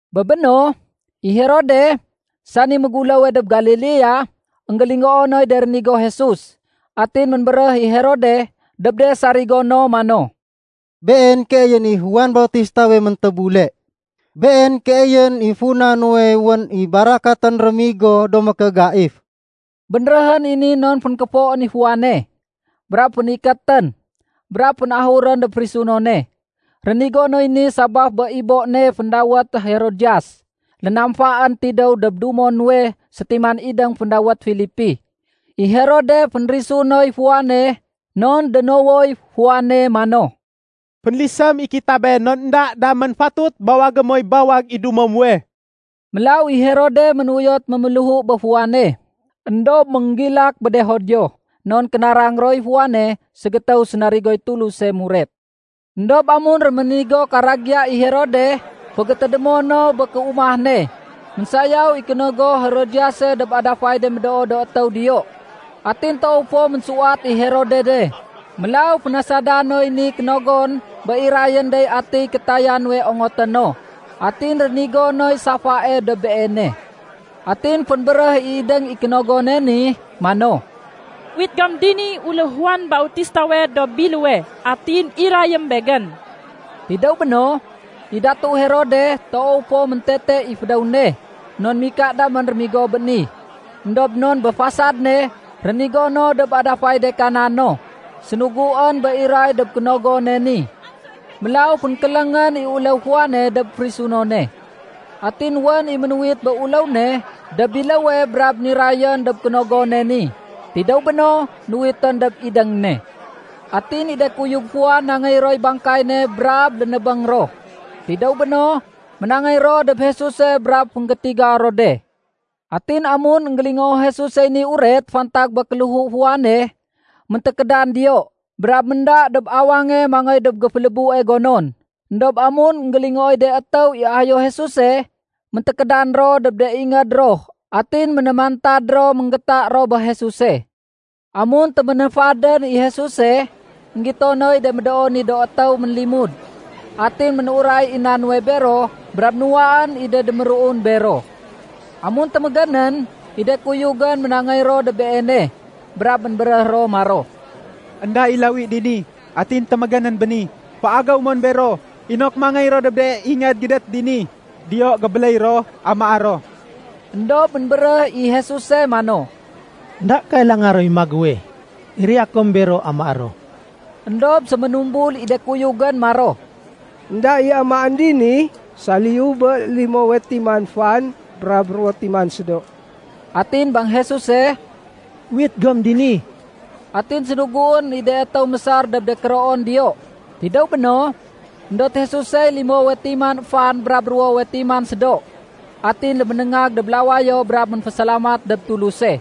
Bé béno, i Herode, sani méguléwe dob Galilea, énggélingoo noy de rénigo Jesus. Atin ménbéréh i Herode dob de sarigo no mano, “Been keeyén i Juan Bautistawe méntébule. Been keeyén i funa nuwe wén i barakatén rémigo do mékégaif.” Bénréhén i ni non fénkéfoén i Juane, brab fénikétén, brab fénahurén dob férisunone. Rénigo noy ni sabaf bé ibo ne féndawét Herodiyas lénamfaén tidéw dob dumo nuwe sétiman idéng féndawét Filipi. I Herode fénférisu noy Juane non dénowoy Juane mano, “Fénlisém i kitabé non énda damén fatut bawagé moy bawag i dumo muwe.” Mélaw i Herode ménuyot méméléhu bé Juane, éndob ménggilak bé de Judio non kénarang roy Juane ségétéw sénarigoy Tuluse muret. Endob amun réménigo karagiya i Herode fégétédémo no bé kéumah ne, ménsayaw i kénogo Herodiyase dob adafay de médoo do étéw diyo. Atin toow fo ménsuwat i Herode de. Mélaw fénasada noy ni kénogon bé irayén dey atiy kétaya nuwe ongoté no. Atin rénigo noy safae dob beene. Atin fénbéréh i idéng i kénogone ni mano, “Uwit gom diniy uléw Juan Bautistawe dob biléwe, atin irayém begén.” Tidéw béno, i Datu Herode toow fo méntete i fédéw ne non mika damén rémigo bé ni. Endob non bé fasad ne rénigo no dob adafay de kana no, sénuguén bé iray dob kénogone ni. Mélaw fénkéléngén i uléw Juane dob férisunone. Atin wén i ménuwit bé uléw ne dob biléwe brab nirayén dob kénogone ni. Tidéw béno, nuwitén dob idéng ne. Atin i de kuyug Juan nangéy roy bangkay ne brab lénébéng ro. Tidéw béno, ménangéy ro dob Jesuse brab fénggétiga ro de. Atin amun énggélingoo Jesusey ni uret fantag bé kéléhu Juane, méntékédan diyo brab ménda dob awange mangéy dob géfélébue gonon. Endob amun énggélingooy de étéw i ayo Jesuse, méntékédan ro dob de ingéd ro atin ménémantad ro ménggéta ro bé Jesuse. Amun téménéfadén i Jesuse, énggito noy de médoo ni do étéw ménlimud. Atin ménuray i na nuwe bero brab nuwaén i de déméruun bero. Amun témégénén i de kuyugén ménangéy ro dob Beene brab ménbéréh ro maro, “Enda i lawi dini, atin témégénén béni. Féagéw mon bero inok mangéy ro dob de ingéd gédét dini. Diyo gébéléy ro amaé ro.” Endob ménbéréh i Jesuse mano, “Enda kailanga roy magéwe. Iraya kom bero amaé ro.” Endob séménumbul i de kuyugén maro, “Enda i amaén dini saliyu bé limowe timan fan brab ruwo timan sédo.” Atin bang Jesuse, “Uwit gom dini.” Atin sénuguén i de étéw mésar dob de kéroon diyo. Tidéw béno, éndot Jesusey limowe timan fan brab ruwowe timan sédo, atin léménéngag dob lawayo brab ménfésalamat dob Tuluse.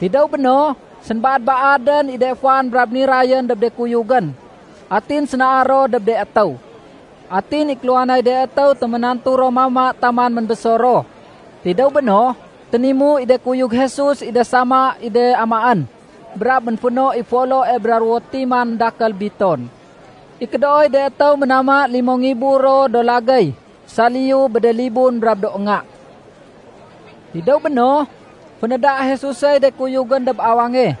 Tidéw béno, sénbaad-baadén i de fan brab nirayén dob de kuyugén. Atin sénaar ro dob de étéw. Atin i kéluhanay de étéw téménantu ro mama taman ménbésor ro. Tidéw béno, ténimu i de kuyug Jesus i de sama i de amaén brab ménféno i foloe bra ruwo timan dakél biton. I kédooy de étéw ménama limo ngibu ro do lagéy saliyu bé de libun brab do nga. Tidéw béno, fénéda Jesusey de kuyugén dob awange,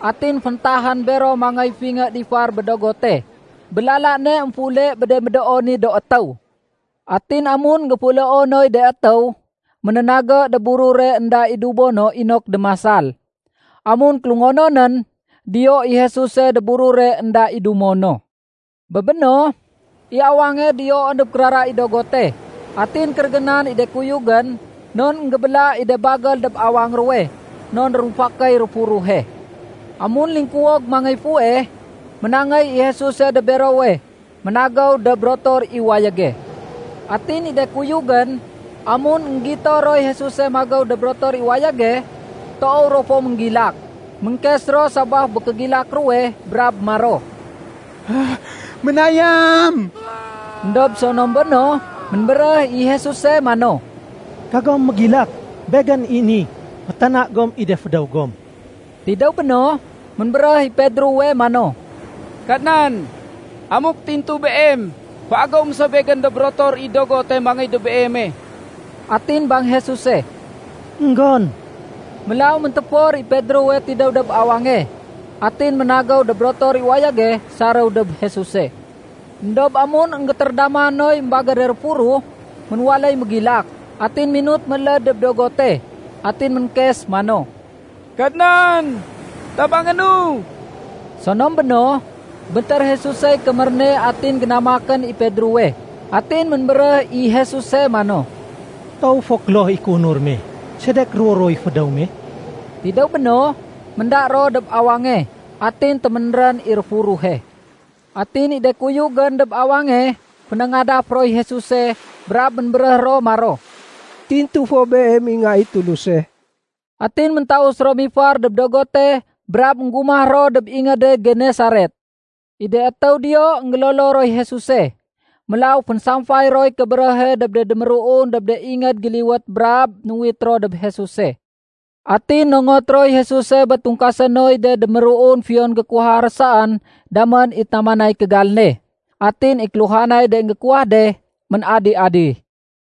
atin féntahén bero mangéy fingé difar bé dogote, bé lala ne émféule bé de médoo ni do étéw. Atin amun énggéféuleo noy de étéw, ménénagé dob burure énda i dumo no inok démasal. Amun kélungononén, diyo i Jesuse dob burure énda i dumo no. Bé béno, i awange diyoén dob kérara i dogote. Atin kérégénan i de kuyugén non énggébéla i de bagél dob awang ruwe, non rumfakéy réfuruhe. Amun lingkuwog mangéy fuweh, ménangéy i Jesuse dob berowe ménagéw dob rotor i wayége. Atin i de kuyugén, amun énggito roy Jesuse magéw dob rotor i wayége, toow ro fo ménggilak. Ménkes ro sabaf bé kégilak ruwe brab maro, “Ménayam!” Endob sonom béno, ménbéréh i Jesuse mano, “Kagom mégilak! Begén. Fétana gom i de fédéw gom.” Tidéw béno, ménbéréh i Pedrowe mano, “Kadnan, amuk tintu Beem, féagéwém so begén dob rotor i dogote mangéy dob Beeme.” Atin bang Jesuse, “Enggon.” Mélaw méntéfor i Pedrowe tidéw dob awange atin ménagéw dob rotor i wayége saréw dob Jesuse. Endob amun énggétérédama noy émbagére réfuruh, ménwaléy mégilak, atin minut méléd dob dogote. Atin ménkes mano, “Kadnan, tabangénu.” Sonom béno, béntér Jesusey kémér ne atin génamakén i Pedrowe. Atin ménbéréh i Jesuse mano, “Toow fo kloh i kéunur me. Sedek ruwo-ruwoy fédéw me?” Tidéw béno, ménda ro dob awange, atin téménrén i réfuruhe. Atin i de kuyugén dob awange fénéngadaf roy Jesuse brab ménbéréh ro maro, “Tintu fo Beem i Nga i Tuluse!” Atin méntaus ro mifar dob dogote brab énggumah ro dob ingéde Genesaret. I de étéw diyo énggélolo roy Jesuse. Mélaw fénsamfay roy kébéréhe dob de déméruun dob de ingéd géliwét brab nuwit ro dob Jesuse. Atin nongot roy Jesuse bé tungkasé noy de déméruun fiyon gékuwaha ro saén damén i tamanay kégal ne. Atin i kéluhanay de énggékuwah de, ménadi-adi.